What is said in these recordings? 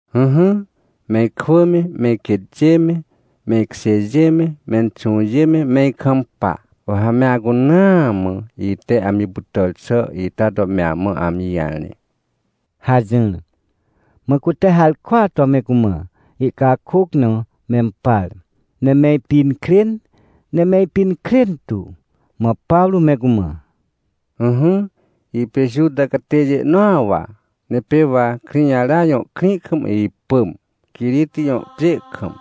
— Ỹhỹ, me ikwỳ me, me iquêtjê me, me ikjêjê me, menxũjê, me ikampa. Wa ha me acunaa mã ite amji pytàr xà ita to me amã amji jarẽ — hajỹr. Mã cute harkwaa to me cumã ihcakôc na mempar, ne me ipinkrên, ne me ipinkrên tu. Mã Pawrô me cumã: — Ỹhỹ, ipê Juta catêjê nõa wa, ne pê wa Krĩjara jõ krĩ kam ipỳm, Quiriti jõ pjê kam,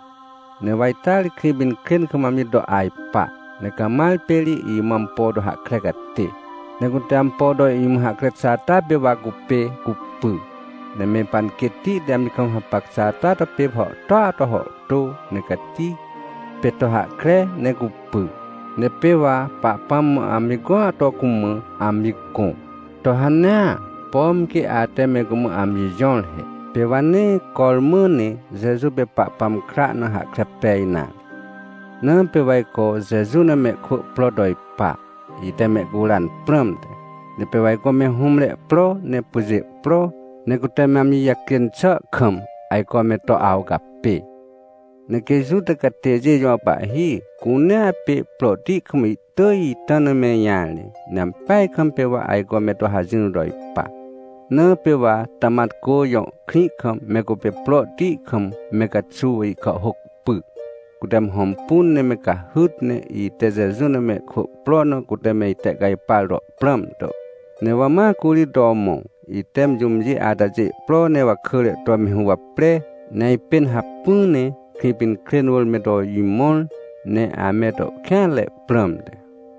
ne wa ita ri Krĩpinkrên kam amji to ajpa, ne Camar pê ri imã ampo to hahkre catê. Ne cute ampo to imã hahkre xà ata pê wa cupê cupy, ne me panquêtti te amji kam hapac xà ata pê hàhtôa to hàhtô, ne cati, pê to hahkre ne cupy. Ne pê wa Pahpãm mã amji gõa to cumã amji gõ, to hanea, pom quê ate me cumã amji jõr he. Pê wa nee cormã ne Jeju pê Pahpãm kra na hahkre pej nare. Na pê wa ajco Jeju na mehkwỳ pro to ipa, ite mehcuran prãmte, ne pê wa ajco me hũmre pro, ne pyjê pro, ne cute me amji jacjên xà kam ajco me to awcapê. Ne quê Juta catêjê jõ pahhi cunea pê prohti kam ihtỳj ita na me ijarẽ, ne ampeaj kam pê wa ajco me to hajỹr to ipa. Na pê wa Tamatcô jõ krĩ kam me cupê prohti kam me caxuw ihkàhhôc py, cute me hõmpun ne me cahyt, ne ite Jeju na mehkwỳ pro na cute me itehcajpar to prãm to. Ne wa ma curi to mõ, ite me jũmjê atajê ihpro ne wakỳre to me huwapre, ne ajpên hacpỹ ne Krĩpinkrên wỳr me to imõr, ne ame to kêanre prãmte.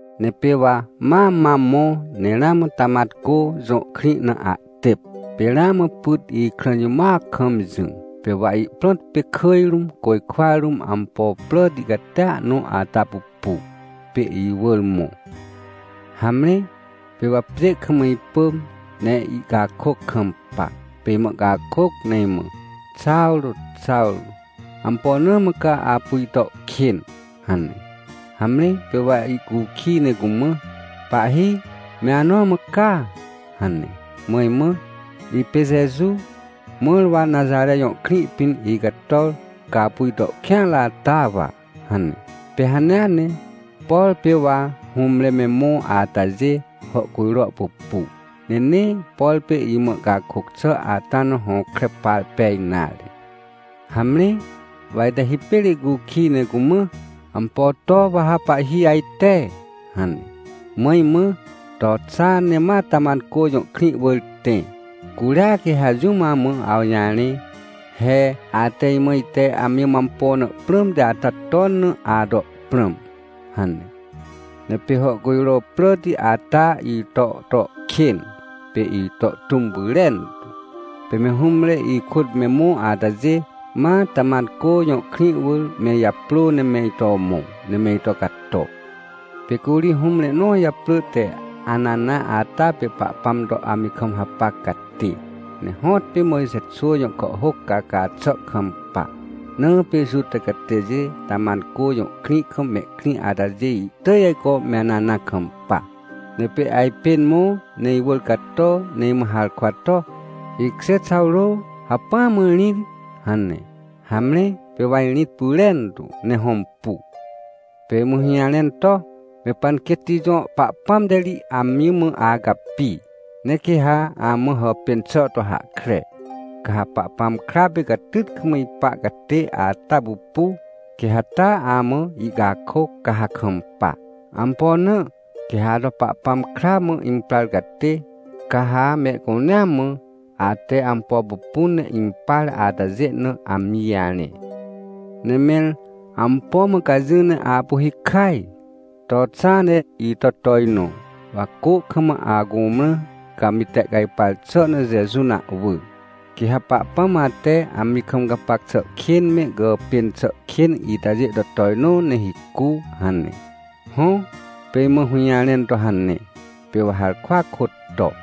— Ne pê wa ma mam mõ, ne ramã Tamatcô jõ krĩ na ahtêp, pê ramã pyt ikrã jimoac kam jỹ, pê wa ihprõt pê kỳj rũm, côjkwa rũm ampo pràti catia nõ ata pupu, pê iwỳr mõ. Hamre, pê wa pjê kam ipỳm, ne ihcakôc kampa, pê imã ihcakôc ne imã: “Xawrô, Xawrô! Ampo na mã ca apu ito kên?” hane. — Hamre, pê wa ihcukij ne cumã: “Pahhi, me anõ mã ca?” hane. Mã imã: “Ipê Jeju, mãr wa Naxare jõ krĩ pĩn icator, ca apu ito kêanre ata wa” hane. — Pê hanea ne, por pê wa hũmre me mõ atajê, hàhcujro pupu, ne nee, por pê imã ihcakôc xà ata na hõkre par pej nare. Hamre, wa ite hipêr ihcukij ne cumã: “Ampo to wa ha pahhi ajte?” hane. Mã imã: “To xa ne ma Tamatcô jõ krĩ wỳr tẽ, curia quê ha jũm amã awjarẽ, he ate imã ite amji mã ampo na prãmti ata ton na ato prãm” hane. Ne pê hàhcujro pràti ata ito to kên, pê ito tũm pyrentu. Pê me hũmre ikôt me mõ atajê, ma Tamatcô jõ krĩ wỳr me ijaprô ne me ito mõ, ne me ito cato. — Pê curi hũmre nõ japrỳ te Anana ata pê Pahpãm to amji kam hapac catê, ne hõtpê Mojxe xwỳ jõ kàhhôc caca xà kampa. Na pê Juta catêjê Tamatcô jõ krĩ kam mehkrĩ atajê ihtỳj ajco me Anana kampa. Ne pê ajpên mõ, ne iwỳr cato, ne imã harkwa to: “Ikjê Xawrô, hacpỹa ma rĩt!” hane. Hamre, pê wa irĩt pyrentu, ne hõmpu. — Pê imã hũjarẽn to: “Me panquêtti jõ Pahpãm te ri amji mã acapi, ne quê ha amã hàpên xà to hahkre. Ca ha Pahpãm kra pê catyt kam ipa catê ata pupu, quê ha taa amã ihcakôc, ca ha kampa. Ampo na? Quê ha ato Pahpãm kra mã imprar catê. Ca ha mehcunea mã, ate ampo pupun ne impar atajê na, amji jarẽ. Ne mẽr, ampo mã ca jỹ ne apu hikaj? To xa, ne ito tojnõ, wa cô kam acumrã, ca amji tehcajpar xà na Jeju na ahwỳ, quê ha Pahpãm ate amji kam gapac xà kên me gàpên xà kên itajê to tojnõ ne hicu” hane. Hõ, pê imã hũjarẽn to hane, pê wa harkwa kôt to.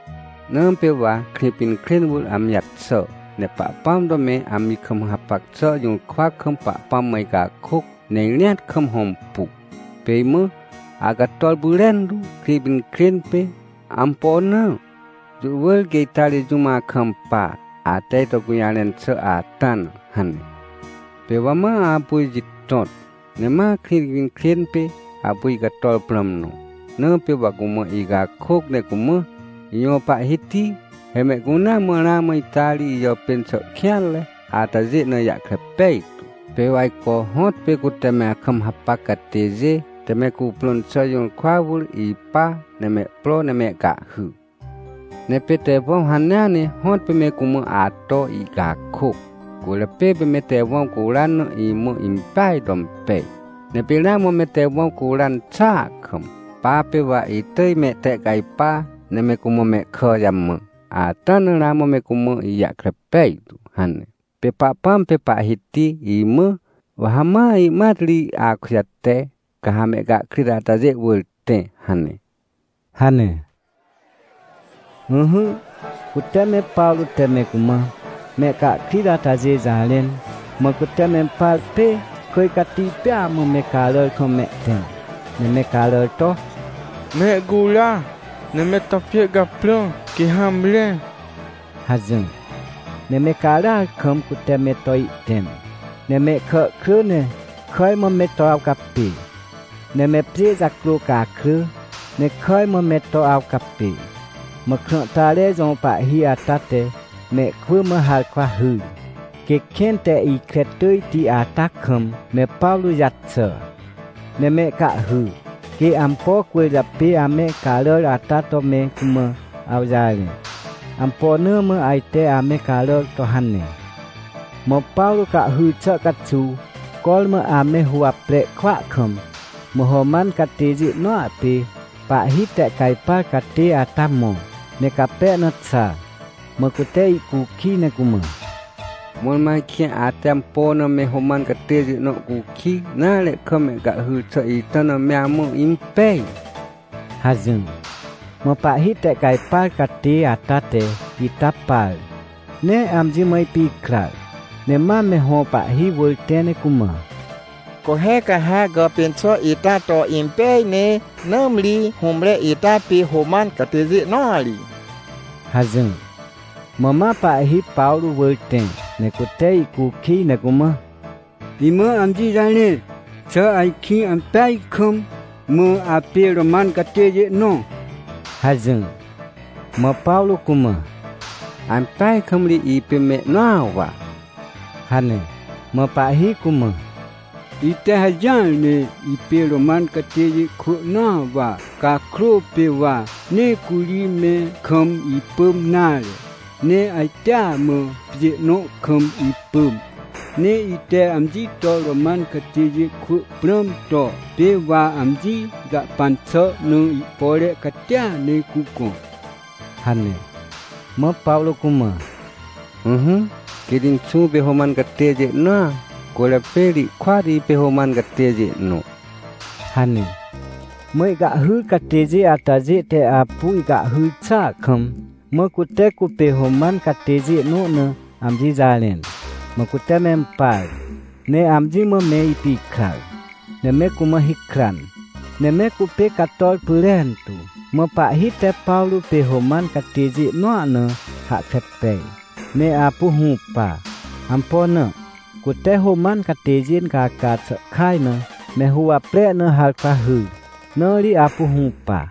— Na pê wa Krĩpinkrên wỳr amji jaxà, ne Pahpãm to me amji kam hapac xà jũrkwa kam Pahpãm mã icakôc, ne irĩat kam hõmpu. Pê imã: “Acator pyrentu, Krĩpinkrên pê. Ampo na? Jũ wỳr quê ita ri jũm akampa, ate ito gũjarẽn xà ata na” hane. — Pê wa ma apu ijitõt, ne ma Krĩpinkrên pê apu icator prãm nõ, na pê wa cumã icakôc ne cumã: “Ijõ Pahhiti, he mehcunea mã ramã ita ri ijàpên xà kêanre atajê na ijahkre pejtu. Pê wa ajco hõtpê cute me akam hapac catêjê te me cuprõn xà jũrkwa wỳr ipa, ne mehpro ne mehcahhy. Ne pê Tewãw hanea ne hõtpê me cumã ato ihcakôc. Cwỳrjapê pê me Tewãw curan na imã impeaj to impej. Ne pê ramã me Tewãw curan xàa kam, pa pê wa itỳj mehtehcajpa ne me cumã mehkà jamã, ata na ramã me cumã ijahkre pejtu” hane. — Pê Pahpãm pê Pahhiti imã: “Wa ha ma ihmat ri akujate, ca ha mehcahkrit atajê wỳr tẽ” hane — hane. Ỹhỹ, cute me Pawrô te me cumã mehcahkrit atajê jarẽn, mã cute mempar pê kỳj cati pêa mã me caràr kam mehtẽm, ne me caràr to: — Mehcura! Ne me to pjê caprã, quê hamre! — hajỹr. Ne me caràar kam cute me to ihtẽm, ne mehkà krỳ ne kàj mã me to awcapê, ne me pjê jacrô cakrỳ, ne kàj mã me to awcapê. Mã krãhtare jõ pahhi ata te mehkwỳ mã harkwa hyr, quê kẽn te ikre tỳjti ata kam me Pawrô jaxà, ne mehcahhy, quê ampo cwỳrjapê ame caràr ata to me cumã awjarẽ, ampo na mã ajte ame caràr to hane. Mã Pawrô cahhyr xà caxuw, cormã ame huwapre kwỳa kam, mã Roman catêjê nõa pê pahhi tehcajpar catê ata mõ ne cape na xa, mã cute ihcukij, ne cumã: — Mõrmõ ajkĩ ate ampo na me Roman catêjê nõ cukij nare kam mehcahhyr xà ita na me amã impej? — hajỹr. Mã pahhi tehcajpar catê ata te ita par, ne amji mã ipikrar, ne ma me hõ pahhi wỳr tẽ ne cumã: — Co he, ca ha gàpên xà ita to impeaj ne! Nãmri hũmre ita pê Roman catêjê nõa ri — hajỹr. Mã ma pahhi Pawrô wỳr tẽ ne cute ihcukij, ne cumã: — Imã amji jarẽ, xà ajkĩ ampeaj kam apê Roman catêjê nõ? — hajỹr. Mã Pawrô cumã: — Ampeaj kam ri ipê mehnõa wa — hane. Mã pahhi cumã: — Ite hajỹar ne ipê Roman catêjê kwỳ nõa wa cakrô, pê wa nee curi me kam ipỳm nare, ne ajtea mã pjê nõ kam ipỳm. Ne ite amji to Roman catêjê kwỳ prãm to pê wa amji jahpan xà na ihpore catia ne cugõ — hane. Mã Pawrô cumã: — Ỹhỹ, quêt inxũ pê Roman catêjê nõa, cwỳrjapê ri ihkôat ipê Roman catêjê nõ — hane. Mã ihcahhyr catêjê atajê te apu ihcahhyr xàa kam, mã cute cupê Roman catêjê nõ na amji jarẽn, mã cute mempar, ne amji mã me ipikrar, ne me cumã hikran, ne me cupê cator pyrentu. Mã pahhi te Pawrô pê Roman catêjê nõa na hahkre pej, ne apu hũpa. Ampo na? Cute Roman catêjê incaca xà kaj na me huwapre na harkwa hyr, na ri apu hũpa.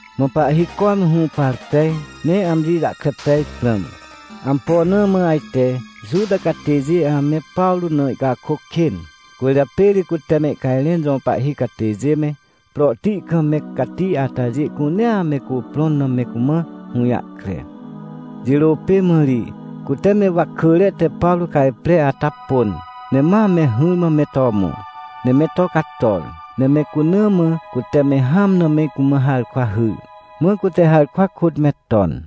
Mã pahhi cormã hũpar pej, ne amji jahkre pej prãm, ampo na mã ajte Juta catêjê ame Pawrô na ihcakôc kên. Cwỳrjapê ri cute mehcajrẽn jõ pahhi catêjê me, prohti kam me cati atajê cunea me cuprõn na me cumã hũjahkre. Jirô pê mã ri cute me wakỳre te Pawrô cajpre ata pôn, ne ma me hỹrmã me to mõ, ne me to cator, ne me cuna mã cute me hãm na me cumã harkwa hyr. Mã cute harkwa kôt me ton.